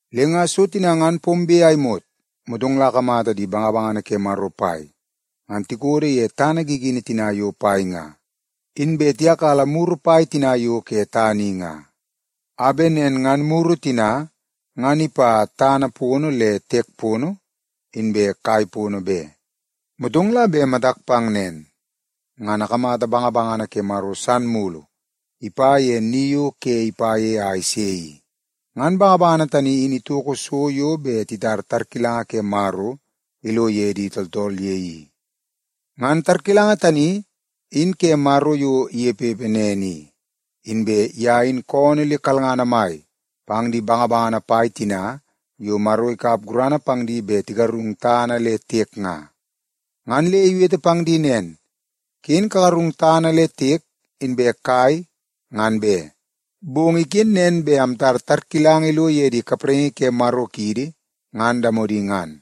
Le nga so tina ngan pombe a imot, motong la akamata di bangabangana ke Maro pai ngan tikodo ye tana gigini tina yo pai nga. Inbe tiyakala muru pai tina yo ke tana i nga, a bet nen ngan muru tina ngan ipa tana pono le tiek pono inbe kai pono be. Motong la bet matak pang nen, ngan akamata bangabangana ke Maro san mulu ipa ye ni yo ke ipa ye a ise i. Ngan bangabangana tani in itoko so yo bet titar tarkilanga ke Maro ilo ye di tooltool ye i. Ngan tarkilanga tani in ke Maro yo inepepe nen i. Inbe ye in koonoo le kalngana mai pang di bangabangana pai tina yo Maro ikap gurana pang di bet tigarung tana le tiek nga. Ngan le iwete pang di nen, “Ken kagarung tana le tiek inbe kai ngan be. Bong iken nen bet amtar tarkilanga ilo ye di kapraingi ke Maro kiidi ngan damodi ngan.”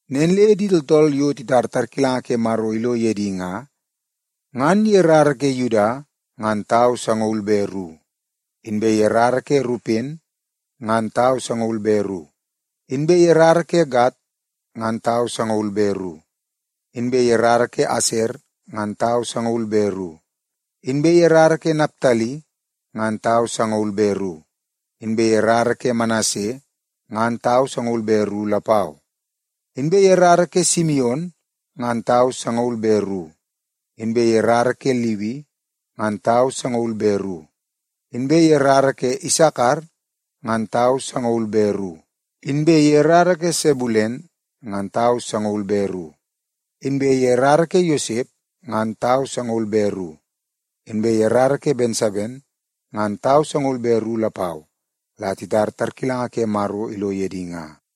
Nen le di tooltool yo titar tarkilanga ke Maro ilo ye di nga, ngan ye rara ke Yuda ngan tau sangaul be ru, inbe ye rara ke Rupen ngan tau sangaul be ru, inbe ye rara ke Gad ngan tau sangaul be ru, inbe ye rara ke Aser ngan tau sangaul be ru, inbe ye rara ke Naptali ngan tau sangaul be ru, inbe ye rara ke Manase ngan tau sangaul be ru lapau. Inbe ye rara ke Simion ngan tau sangaul be ru, inbe ye rara ke Liwi ngan tau sangaul be ru, inbe ye rara ke Isakar ngan tau sangaul be ru, inbe ye rara ke Sebulen ngan tau sangaul be ru, inbe ye rara ke Yosep ngan tau sangaul be ru, inbe ye rara ke Bensamen ngan tau sangaul be ru lapau la titar tarkilanga ke Maro ilo ye di nga.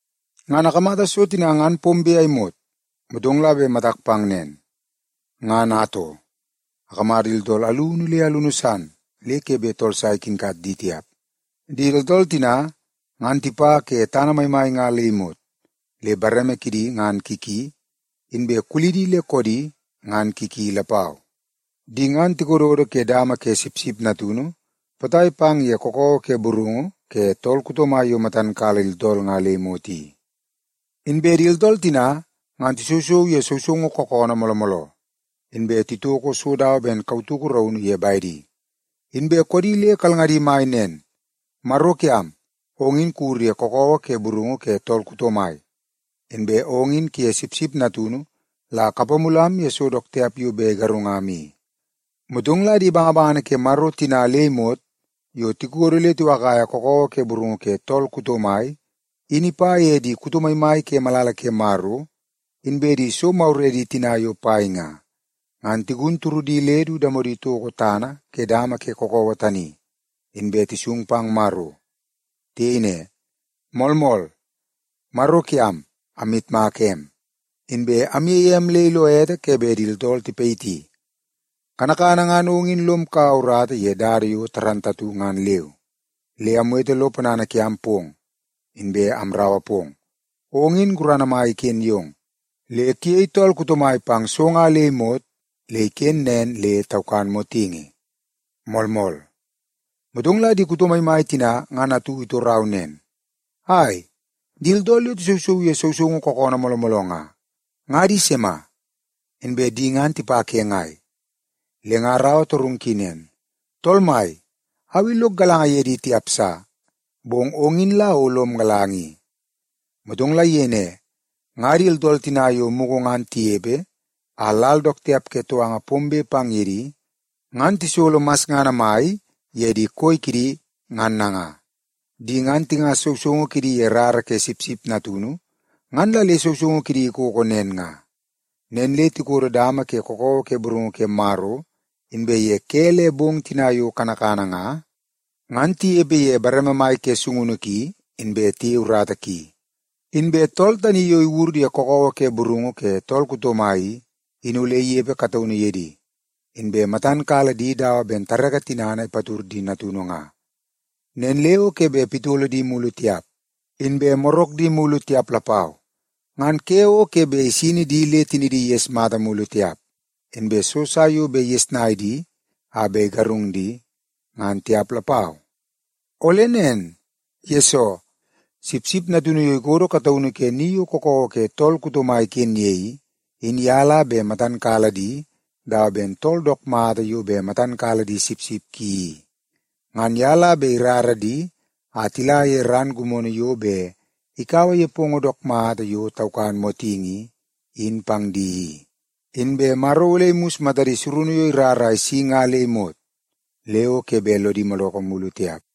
Ngan akamata so tina ngan pombe a imot, motong la bet matak pang nen, ngan atoo, akamata di tooltool alunu le alunu san le ke bet tool sa ikinkat di tiap. Di tooltool tina, ngan tipa ke tana maimai nga le imot, le bareme kidi ngan ki ki, inbe kulidi le koodi ngan ki ki lapau. Di ngan tikododo ke dama ke Sipsip Natunu potai pang ye kakawa ke burungu ke tool kuto mai yo matan kala di tooltool nga le imot i. Inbe di tooltool tina ngan tisousou ye sousoungu kookoonoo mooloo mooloo, inbe titoko so ben kautuku raunu ye bedi. Inbe koodi le kalngadi mai nen, “Maro kiam, ong in kuwur ye kakawa ke burungu ke tool kuto mai, inbe ong in kuye Sipsip Natunu la kapamulam ye so dook tiap yo bet igarungam i.” Motong la di bangabangana ke Maro tina le imot yo tikodo le tiwakaia kakawa ke burungu ke tool kuto mai in ipa ye di kuto maimai ke malala ke Maro, inbe di so maguredi tina yo pai nga, ngan tigun turudi le du damodi toko tana ke dama ke kakawa tani, inbe tisung pang Maro. Tiyei ne, “Moolmool! Maro kiam, amyitmaka em, inbe amyeie em le ilo ete ke bet di tooltool tipayiti. Kanakana ngan ong in lom kaua urata ye dada yo dook mata ngan leu, le amwete lo ponana kiam pong, inbe amraua pong. Ong in gurana mai iken yong, le kuyei tool kuto mai pang so nga le imot le iken nen le taukan motingi. Moolmool!” Motong la di kuto maimai tina ngan atu itorau nen, “Ai, di tooltool yo tisousou ye sousoungu kookoonoo mooloo mooloo nga, nga di sima? Inbe di ngan tipa ke ngai?” Le nga araua torungu ki nen, “Tool mai, au i lok galanga ye di tiap sa, bong ong in la o lom galanga i.” Motong la iyei ne, “Nga di tooltool tina yo mugu ngan tinepe a lal dook tiap ke touanga pombe pang ye di ngan tisolo masngana mai ye di koi kidi ngan nanga. Di ngan tingas sousoungu kidi ye rara ke Sipsip Natunu ngan la le sousoungu kidi ikoko nen nga. Nen le ‘tikodo dama ke kakawa ke burungu ke Maro, inbe ye ke le bong tina yo kanakana nga, ngan tinepe ye bareme mai ke sungunu ki, inbe tiyei urata ki. Inbe tool tani yo iwur ye kakawa ke burungu ke tool kuto mai i, in ole inepe kataunu ye di, inbe matan kala di dawa ben tareke tinana ipatud di natunu nga. Nen le o ke bet pitolo di mulu tiap, inbe morak di mulu tiap lapau. Ngan ke o ke bet isini di le tinidi iges mata mulu tiap, inbe so sa yo bet igesnai di a bet igarung di, ngan tiap lapau. Ole nen, yesoo Sipsip Natunu yo ikodo kataunu ke ni yo kakawa ke tool kuto mai iken ye i, in ye la bet matan kala di dawa ben tool dook mata yo bet matan kala di sipsip ki i. Ngan ye la bet irara di a tila ye ran gimono yo bet ikaua nepongo dook mata yo taukan motingi i, in pang di i. Inbe Maro ole imus matadi surunu yo irar a isi nga le imot, le o ke bet lodi madoko mulu tiap.’”